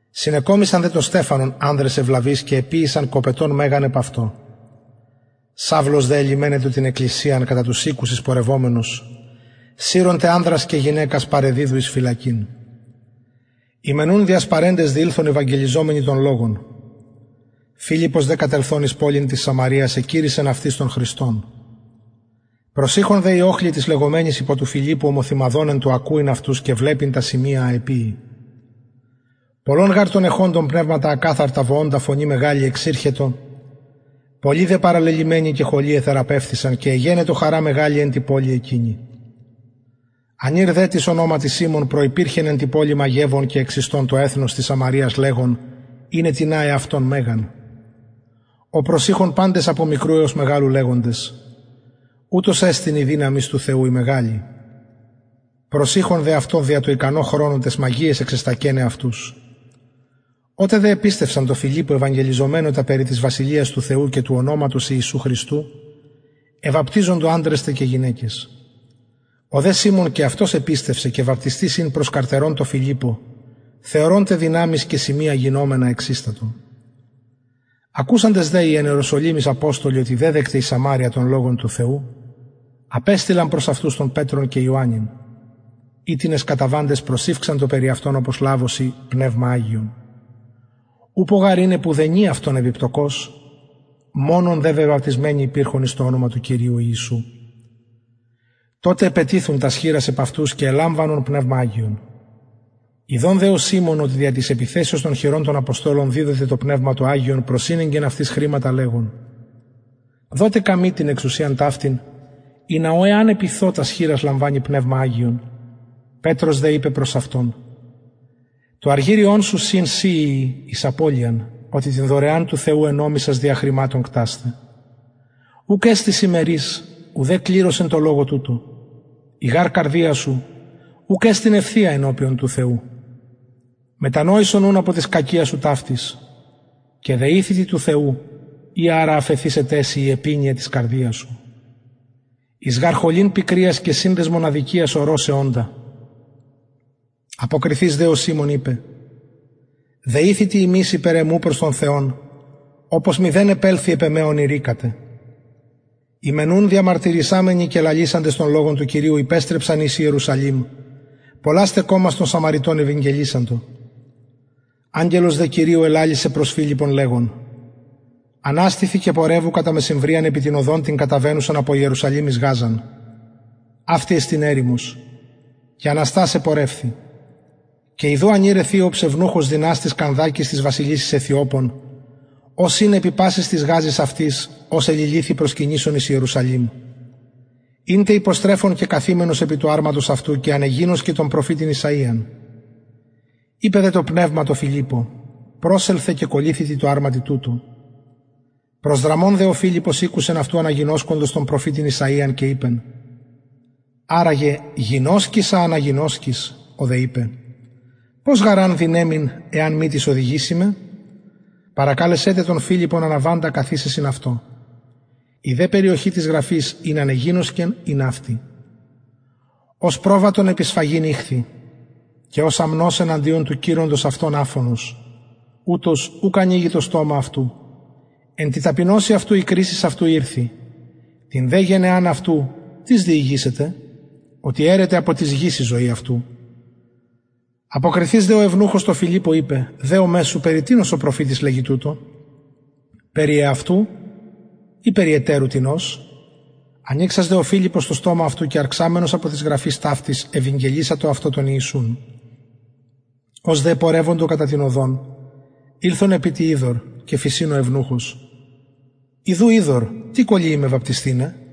συνεκομισαν δε τον στεφανον ανδρες ευλαβεις και εποιησαντο κοπετον μεγαν επ αυτω σαυλος δε ελυμαινετο την εκκλησιαν κατα τους οικους εισπορευομενος συρων τε ανδρας και γυναικας παρεδιδου εις φυλακην οι μεν ουν διασπαρεντες διηλθον ευαγγελιζομενοι τον λογον φιλιππος δε κατελθων εις πολιν της σαμαρειας εκηρυσσεν αυτοις τον χριστον προσειχον τε οι οχλοι τοις λεγομενοις υπο του φιλιππου ομοθυμαδον εν τω ακουειν αυτους και βλεπειν τα σημεια α εποιει πολλων γαρ των εχοντων πνευματα ακαθαρτα βοωντα φωνη μεγαλη εξηρχετο πολλοι δε παραλελυμενοι και χωλοι εθεραπευθησαν και εγενετο χαρα μεγαλη εν τη πολει εκεινη ανηρ δε τις ονοματι σιμων προυπηρχεν εν τη πολει μαγευων και εξιστων το εθνος της σαμαρειας λεγων ειναι τινα εαυτον μεγαν ω προσειχον απο μικρου εως μεγαλου λεγοντες ουτος εστιν η δυναμις του θεου η μεγαλη προσειχον δε αυτω δια το ικανω χρονω ταις μαγειαις εξεστακεναι αυτους οτε δε επιστευσαν τω φιλιππω ευαγγελιζομενω τα περι της βασιλειας του θεου και του ονοματος ιησου χριστου εβαπτιζοντο ανδρες τε και γυναικες ο δε σιμων και αυτος επιστευσεν και βαπτισθεις ην προσκαρτερων τω φιλιππω θεωρων τε δυναμεις και σημεια γινομενα εξιστατο ακουσαντες δε οι εν ιεροσολυμοις αποστολοι οτι δεδεκται η σαμαρεια τον λογον του θεου απεστειλαν προς αυτους τον πετρον και ιωαννην οιτινες καταβαντες προσηυξαντο περι αυτων οπως λαβωσιν πνευμα αγιον ουπω γαρ ην επ ουδενι αυτων επιπεπτωκος μονον δε βεβαπτισμενοι υπηρχον εις το ονομα του χριστου ιησου τοτε επετιθουν τας χειρας επ αυτους και ελαμβανον πνευμα αγιον θεασαμενος δε ο σιμων οτι δια της επιθεσεως των χειρων των αποστολων διδοται το πνευμα το αγιον προσηνεγκεν αυτοις χρηματα λεγων δοτε καμοι την εξουσιαν ταυτην ινα ω εαν επιθω τας χειρας λαμβανη πνευμα αγιον πετρος δε ειπεν προς αυτον το αργυριον σου συν σοι ειη εις απωλειαν οτι την δωρεαν του θεου ενομισας δια χρηματων κτασθαι ουκ εστιν σοι μερις ουδε κληρος εν τω λογω τουτω η γαρ καρδια σου ουκ εστιν ευθεια ενωπιον του θεου μετανοησον ουν απο της κακιας σου ταυτης και δεηθητι του θεου ει αρα αφεθησεται σοι η επινοια της καρδιας σου εις γαρ χολην πικριας και συνδεσμον αδικιας ορω σε οντα αποκριθεις δε ο σιμων ειπεν δεηθητε υμεις υπερ εμου προς τον κυριον οπως μηδεν επελθη επ εμε ων ειρηκατε οι μεν ουν διαμαρτυραμενοι και λαλησαντες τον λογον του κυριου υπεστρεψαν εις ιερουσαλημ πολλας τε κωμας των σαμαρειτων ευηγγελισαντο αγγελος δε κυριου ελαλησεν προς φιλιππον λεγων αναστηθι και πορευου κατα μεσημβριαν επι την οδον την καταβαινουσαν απο ιερουσαλημ εις γαζαν αυτη εστιν ερημος και αναστας επορευθη και ιδου ανηρ αιθιοψ ευνουχος δυναστης κανδακης της βασιλισσης αιθιοπων ος ην επι πασης της γαζης αυτης ος εληλυθει προσκυνησων εις ιερουσαλημ ην τε υποστρεφων και καθημενος επι του αρματος αυτου και ανεγινωσκεν τον προφητην ησαιαν ειπεν δε το πνευμα τω φιλιππω προσελθε και κολληθητι τω αρματι τουτω προσδραμων δε ο φιλιππος ηκουσεν αυτου αναγινωσκοντος τον προφητην ησαιαν και ειπεν αρα γε γινωσκεις α αναγινωσκεις ο δε ειπεν πως γαρ αν δυναιμην εαν μη τις οδηγηση με παρεκαλεσεν τε τον φιλιππον αναβαντα καθισαι συν αυτω η δε περιοχη της γραφης ην ανεγινωσκεν ην αυτη ως προβατον επι σφαγην ηχθη και ως αμνος εναντιον του κειροντος αυτον αφωνος ουτως ουκ ανοιγει το στομα αυτου εν τη ταπεινωσει αυτου η κρισις αυτου ηρθη την δε γενεαν αυτου τις διηγησεται οτι αιρεται απο της γης η ζωη αυτου αποκριθεις δε ο ευνουχος τω φιλιππω ειπεν δεομαι σου περι τινος ο προφητης λεγει τουτο περι εαυτου η περι ετερου τινος ανοιξας δε ο φιλιππος το στομα αυτου και αρξαμενος απο της γραφης ταυτης ευηγγελισατο αυτω τον ιησουν ως δε επορευοντο κατα την οδον ηλθον επι τι υδωρ και φησιν ο ευνουχος ιδου υδωρ τι κωλυει με βαπτισθηναι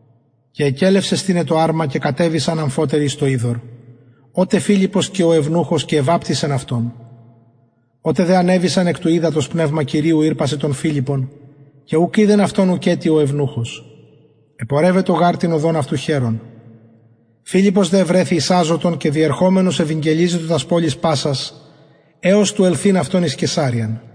και εκελευσεν στηναι το αρμα και κατεβησαν αμφοτεροι εις το υδωρ ο τε φιλιππος και ο ευνουχος και εβαπτισεν αυτον οτε δε ανεβησαν εκ του υδατος πνευμα κυριου ηρπασεν τον φιλιππον και ουκ ειδεν αυτον ουκετι ο ευνουχος επορευετο γαρ την οδον αυτου χαιρων φιλιππος δε ευρεθη εις αζωτον και διερχομενος ευηγγελιζετο τας πολεις πασας εως του ελθειν αυτον εις καισαρειαν